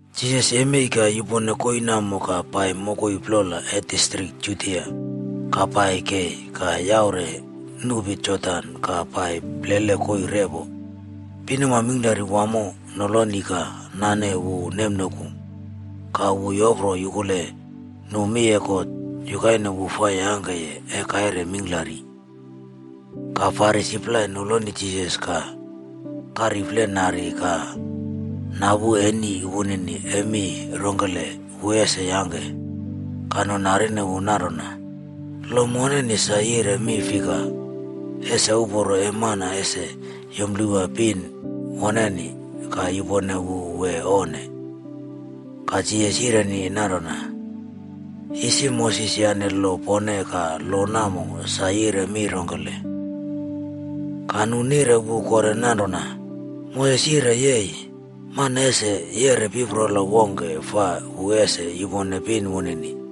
Jisas yemei ka yupone koii namo ka pai mokoi plola e distrik Judia ka pai kei ka yaure nupi Jordan ka pai plele koii repo. Pinuma mingklari wamo noloni ka nane wu nemnoku ka wu yopro yukule nu mi e God yukaine wu fa yangke e kaire mingklari. Ka Farisi plai noloni Jisas ka kariflenari ka napu eni wunini e mi rongkele wu ese yangke. Ka nu narine wu nanrona, “Lo moneni sa yire mi fika, ese uporo e mana ese yumplewa pin woneni ka yupone wu wee onne?” Ka Jisas yire nanrona, “Isi Moses yane lo pone ka lo namo sa yire mi rongkele?” Ka nu nire wu kore nanrona, “Moses yire yei, mana ese yeꞌre piprola wongke fa wu ese yupone pin wunini.”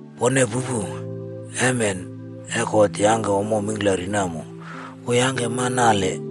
Pone pupu, emen e God yangke ommo mingklari namo, wu yangke mana nale.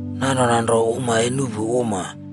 ‘Nanrona nro uma e nuꞌpu uma,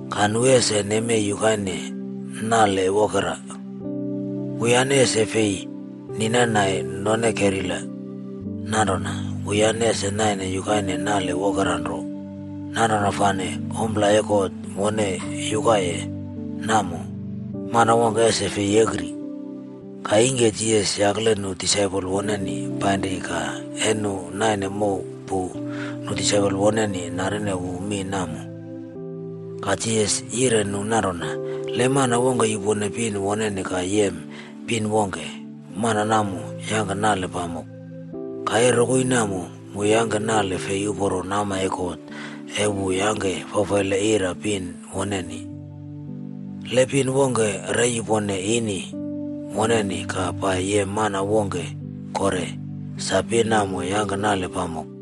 ka nu ese nemei yukaine nale wokera.’b Wuyane ese fei ninanai none kerila nanrona, wuyane ese naine yukaine nale wokera nro. Nanrona fane ompla e God wone yukaye namo, mana wongke ese fei yekri.” Ka ingke Jisas yakle nu disaipol woneni painri ka e nu naine mow pu, nu disaipol woneni narine wu mi namo. Ka Jisas yire nu nanrona, “Le mana wongke yupone pin woneni ka yem pin wongke, mana namo yangke nale pamok. Ka e rokoi namo, wu yangke nale fei uporo nama e God e wu yangke fafaile ira pin woneni. Le pin wongke re yupone ini woneni ka pai yem mana wongke kore, sa pin namo yangke nale pamok.”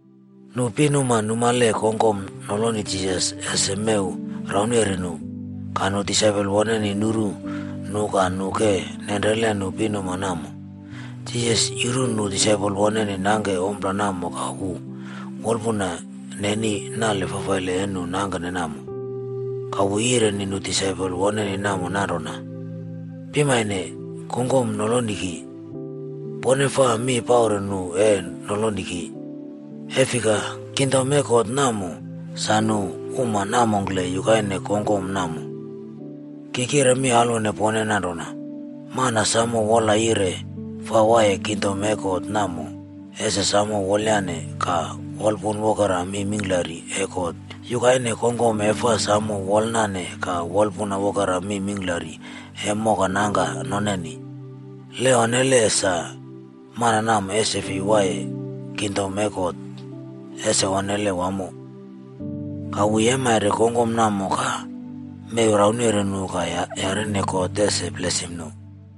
Nu pinuma numale kongkom noloni Jisas ese mew yauneri nu. Ka nu disaipol woneni nuru nu ka nu ke nenrele nu pinuma namo. Jisas yuru nu disaipol woneni nangke ompla namo ka wu wolpuna neni nale fafaile e nu nangkene namo. Ka wu yireni nu disaipol woneni namo nanrona, “Pimane kongkom noloni ki. Pone faa mi paure nu e noloni ki. E fika, kingdom e God namo, sa nu uma namongkle yukaine kongkom namo. Ki kire mi alwone pone nanrona, mana samo wola yire fa waiye kingdom e God namo, ese samo wolyane ka wolpun wokera mi mingklari e God yukaine kongkom e fa samo wolnane ka wolpun wokera mi mingklari e mokanangka noneni. Le onne sa, mana namo ese fei waiye kingdom e God. Ese onnele wamo!” Ka wu yeimare kongkom namo ka mew raune nu ka yarine God ese blesim nu.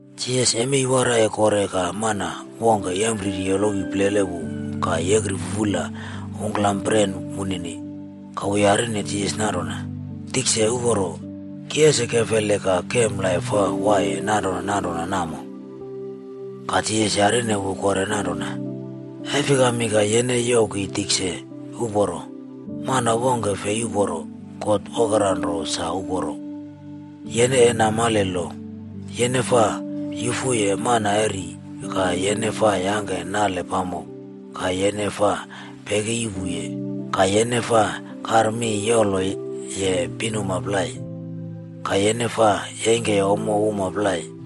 Jisas yemei waraiye kore ka mana wongke yempriri yolowi plele wu ka yekri fufula ungklama pren wunini. Ka wu yarine Jisas nanrona, “Tikse uporo, ki ese kefele ka kem laip fa waiye nanrona nanrona namo?” Ka Jisas yireni wu kore nanrona, “E fikami ka yene youw ki tikse uporo? Mana wongke fei uporo. God wokera nro sa uporo. Yene e namale lo: ‘Yene faa yufu mana ri, ka yene faa yangke nale pamok, ka yene faa peki yuꞌpu, ka yene faa karmiyoloye pinuma plai, ka yene faa yeingke ommo uma plai,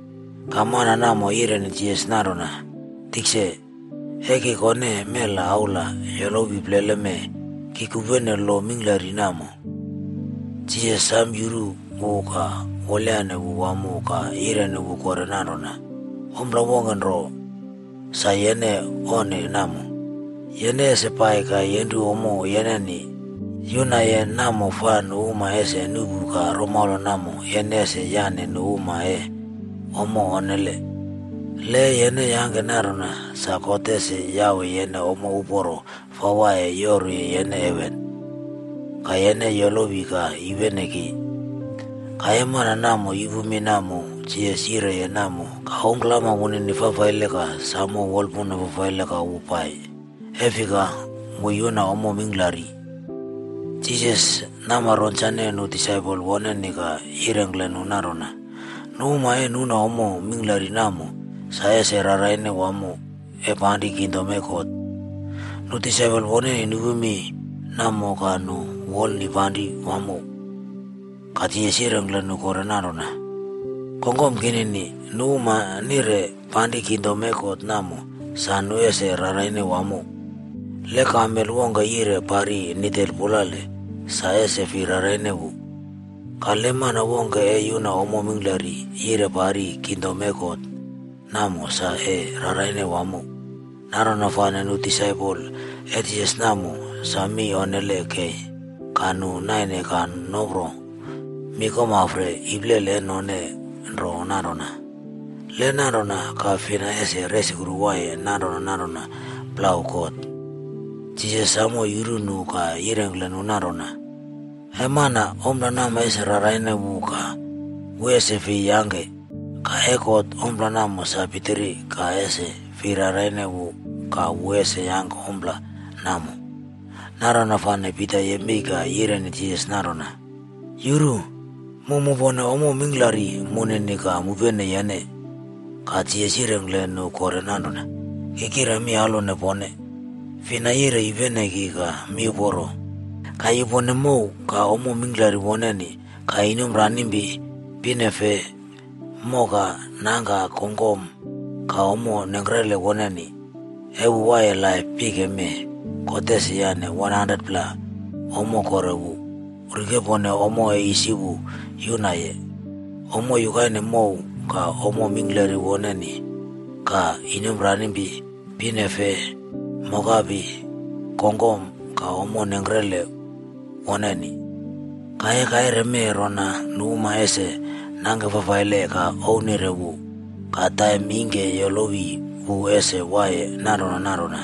Ka mana namo yireni Jisas nanrona, “Tikse, e ki kone mela aula yolowi plele mee, ki kupene lo mingklari namo.” Jisas sam yuru wu ka wolayane wu wamo ka yireni wu kore nanrona, “Ompla wongke nro sa yene onne namo. Yene ese pai ka yenru ommo yene yunaye namo fa nu uma ese nuꞌpu ka romaula namo yene ese yane nu uma e ommo onne. Le e yene yangke nanrona, sa God ese yawe yene ommo uporo fa waiye yoru yene heven. Ka yene yolowi ka yupene ki.” Ka e mana namo yupu mi namo Jisas yireye namo ka ungklama wunini fafaile ka samo wolpuna fafaile ka wu pai. E fika, wu yuna ommo mingklari. Jisas nama ronsane nu disaipol woneni ka yirengkle nu nanrona, “Nu uma e nuna ommo mingklari namo, sa ese raraine wamo e panri kingdom e God.” Nu disaipol woneni nupu mi namo ka nu wolnipanri wamo. Ka Jisas yirengkle nu kore nanrona, “Kongkom kinini, nu uma nire panri kingdom e God namo sa nu ese raraine wamo. Le kamel wongke yire pari nidel pulale, sa ese fi raraine wu. Ka, le mana wongke e yuna ommo mingklari yire pari kingdom e God, namo sa e raraine wamo.” Nanrona fane nu disaipol e Jisas namo sa mi onnele kei ka nu naine ka nopro mi komafre iplele e none nro nanrona, “Le nanrona ka fina ese resukru waiye nanrona nanrona plau God?” Jisas samo yuru nu ka yirengkle nu nanrona, “E mana, ompla namo ese raraine wu ka wu ese fei yangke, ka e God ompla namo sa pitiri ka ese fei raraine wu ka wu ese yangke ompla namo.” Nanrona fane Pita yemei ka yireni Jisas nanrona, “Yuru! Mu mupone ommo mingklari munini ka mupene yene!” Ka Jisas yirengkle nu kore nanrona, “Ki kire mi alwone pone, fina yire yupene ki ka miuporo, ka yupone mow, ka ommo mingklari woneni, ka inomranimpi, pinofe, moka, nangka, kongkom, ka ommo nengkrele woneni, e wu waiye laip pike mee, God ese yane 100pla ommo kore wu, rikepone ommo e isi wu yunaye: Ommo yukaine mow, ka ommo mingklari woneni, ka inomranimpi, pinefe, mokapi, kongkom, ka ommo nengkre woneni. Ka e kaire mee rona nu uma ese nangke fafaile ka ownire wu. Ka taim ingke yolowi wu ese waiye nanrona nanrona.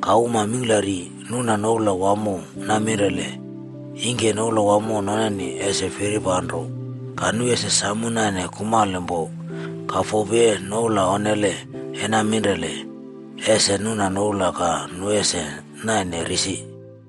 Ka uma mingklari nuna noula wamo naminrele, ingke noula wamo noneni ese firipanro ka nu ese samo naine kumalpo. Ka fopi e noula onnele e naminrele, ese nuna noula ka nu ese naine risi.”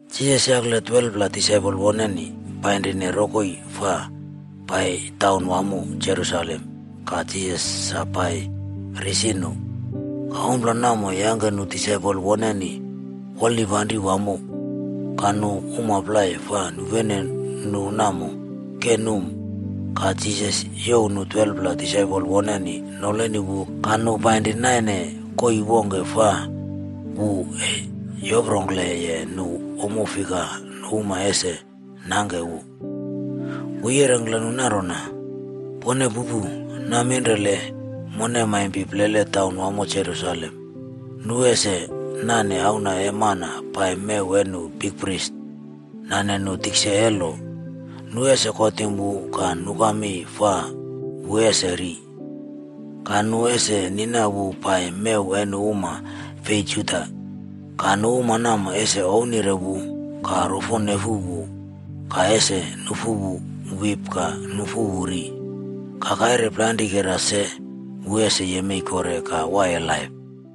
Jisas yakle 12pla disaipol wunini painrine rokoi fa pai taunwamo Jerusalem ka Jisas sa pai risi nu. Ka ompla namo yangke nu disaipol woneni wolnipanri wamo, ka nu uma plai fa nupene nu namo, ke num. Ka Jisas youw nu 12pla disaipol woneni noloni wu ka nu painri naine koii wongke fa wu e yoprongkleye nu ommo fika nu uma ese nangke wu. Wu yirengkle nu nanrona, “Pone pupu. Naminrele mone maimpi plele taunwamo Jerusalem, nu ese nane Auna e Mana pai mew e nu bikpris nane nu tikse e lo. Nu ese kotim wu ka nuka mi fa wu ese ri. Ka nu ese nina wu pai mew e nu uma fei Juda. Ka nu uma namo ese ownire wu ka rofonefu wu ka ese nufu wu wip ka nufu wu ri. Ka kaire plainrikera se wu ese yemei kore ka waiye laip.”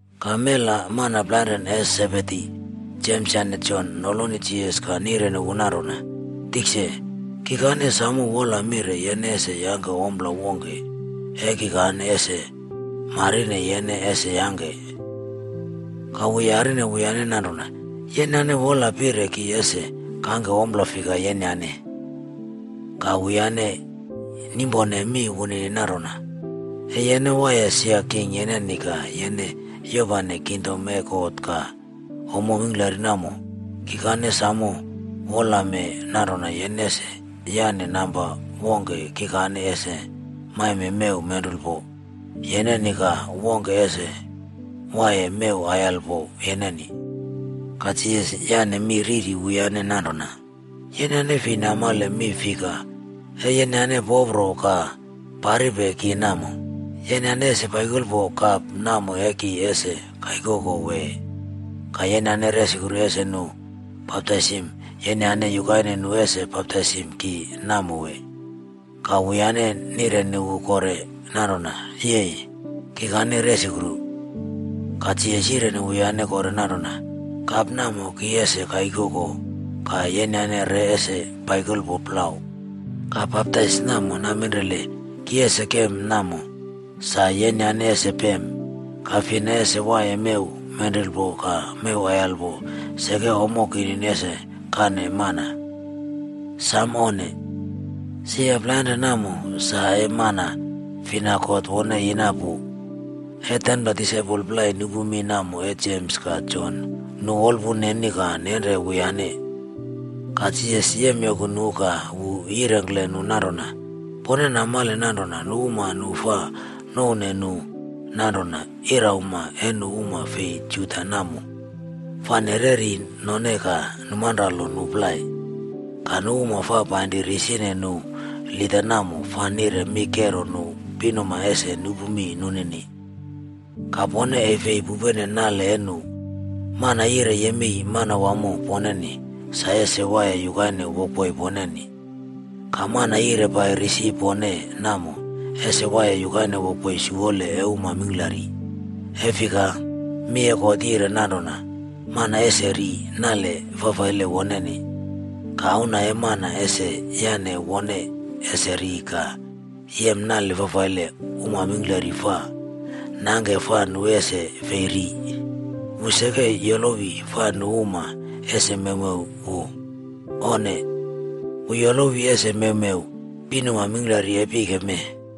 Ka mela mana plainrane e Sebedi, Jems yane Jon noloni Jisas ka nireni wu nanrona, “Tikse, kikane samo wola mire yene ese yangke ompla wongke e kikane ese marine yene ese yangke.” Ka wu yarine wuyane nanrona, “Yenyane wola pire ki ese kangke ompla fika yenyane?” Ka wuyane nimpone mi wunini nanrona, “E yene waiye sia king yeneni ka yene yopane kingdom e God ka ommo mingklari namo, kikane samo wolame nanrona yene ese yane namba wongke kikane ese maime mew menrulpod yeneni ka wongke ese waiye mew aiyalpo yeneni.” Ka Jisas yane mi riri wuyane nanrona, “Yenyane fei namale mi fika e yenyane popro ka paripe ki namo. Yenyane ese paikolpo kap namo e ki ese kaikoko wee? Ka yenyane resukru ese nu baptaisim yenyane yukaine nu ese baptaisim ki namo wee?” Ka wuyane nirene wu kore nanrona, “Yei, kikane resukru.” Ka Jisas yireni wuyane kore nanrona, “Kap namo ki ese kaikoko ka yenyane re ese paikolpo plau. Ka baptais namo naminrele ki ese kem namo, sa yenyane ese pem. Ka fina ese waiye mew menrulpo ka mew aiyalpo seke ommo kinini ese kane mana. Samo onne! Sia plainrane namo sa e mana fina God wone yina pu.” E 10pla disaipol plai nupu mi namo e Jems ka Jon, nu wolpun neni ka nenre wuyane. Ka Jisas yemyoku nu ka wu yirengkle nu nanrona, “Pone namale nanrona nu uma nu fa nouwne nu nanrona irauma e nu uma fi Juda namo, fa nereri none ka numanralo nu plai. Ka nu uma fa painri risi nu lida namo fa nire mi kero nu pinuma ese nupu mi nunini. Ka pone e fi pupene nale e nu. Mana yire yemei manawamo poneni, sa ese waiye yukaine wokboi poneni. Ka mana yire pai risi pone namo, ese waiye yukaine wokboi siwole e uma mingklari. E fika, mi e God yire nanrona, mana ese ri nale fafaile woneni. Ka Auna e Mana ese yane wone ese ri ka yem nale fafaile uma mingklari fa nangke fa nu ese fei ri. Wu seke yolowi fa nu uma ese mewmew wu. Onne! Wu yolowi ese mewmew pinuma mingklari e pike mee.”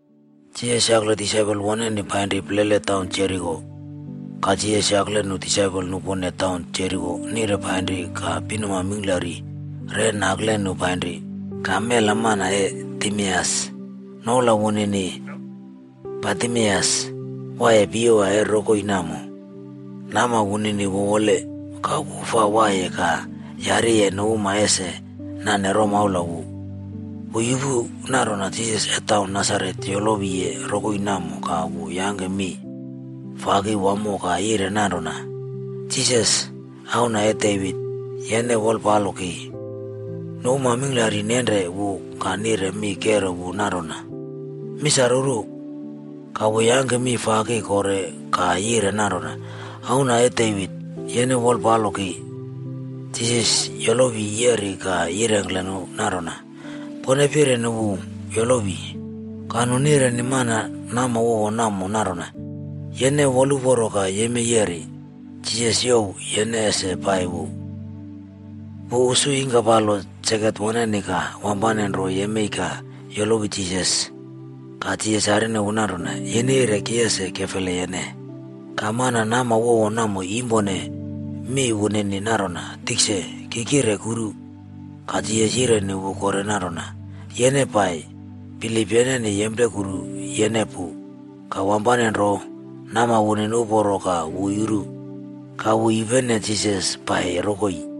Jisas yakle disaipol woneni painri plele taun Jeriko. Ka Jisas yakle nu disaipol nupone taun Jeriko nire painri ka pinuma mingklari re nakle nu painri. Ka mela mana e Timeus, noula wunini Bartimeus, waiye piyewa e rokoi namo. Nama wunini wowole. Ka wu fa waiye ka yariye nu uma ese nane romaula wu. Wu yupu nanrona Jisas e taun Nasaret yolowiye rokoi namo ka wu yangke mi faki wamo ka yire nanrona, “Jisas, Auna e Devit, yene wolpalo ki!” Nu uma mingklari nenre wu ka nire mi kero wu nanrona, “Misaruru!” Ka wu yangke mi faki kore ka yire nanrona, “Auna e Devit, yene wolpalo ki!” Jisas yolowi yeri ka yirengkle nu nanrona, “Pone pireni wu yolowi.” Ka nu nireni mana nama wowo namo nanrona, “Yene woluporo ka yemei yeri, Jisas youw yene ese pai wu.” Wu usu yingkapalo saket woneni ka wampane nro yemei ka yolowi Jisas. Ka Jisas yarine wu nanrona, “Yene yire ki ese kefele yene?” Ka mana nama wowo namo yimpone mi wunini nanrona, “Tikse, ki kire kuru.” Ka Jisas yireni wu kore nanrona, “Yene pai. Bilip yeneni yemplekuru yene pu.” Ka wampane nro, nama wunini uporo ka wu yuru. Ka wu yupene Jisas pai rokoi.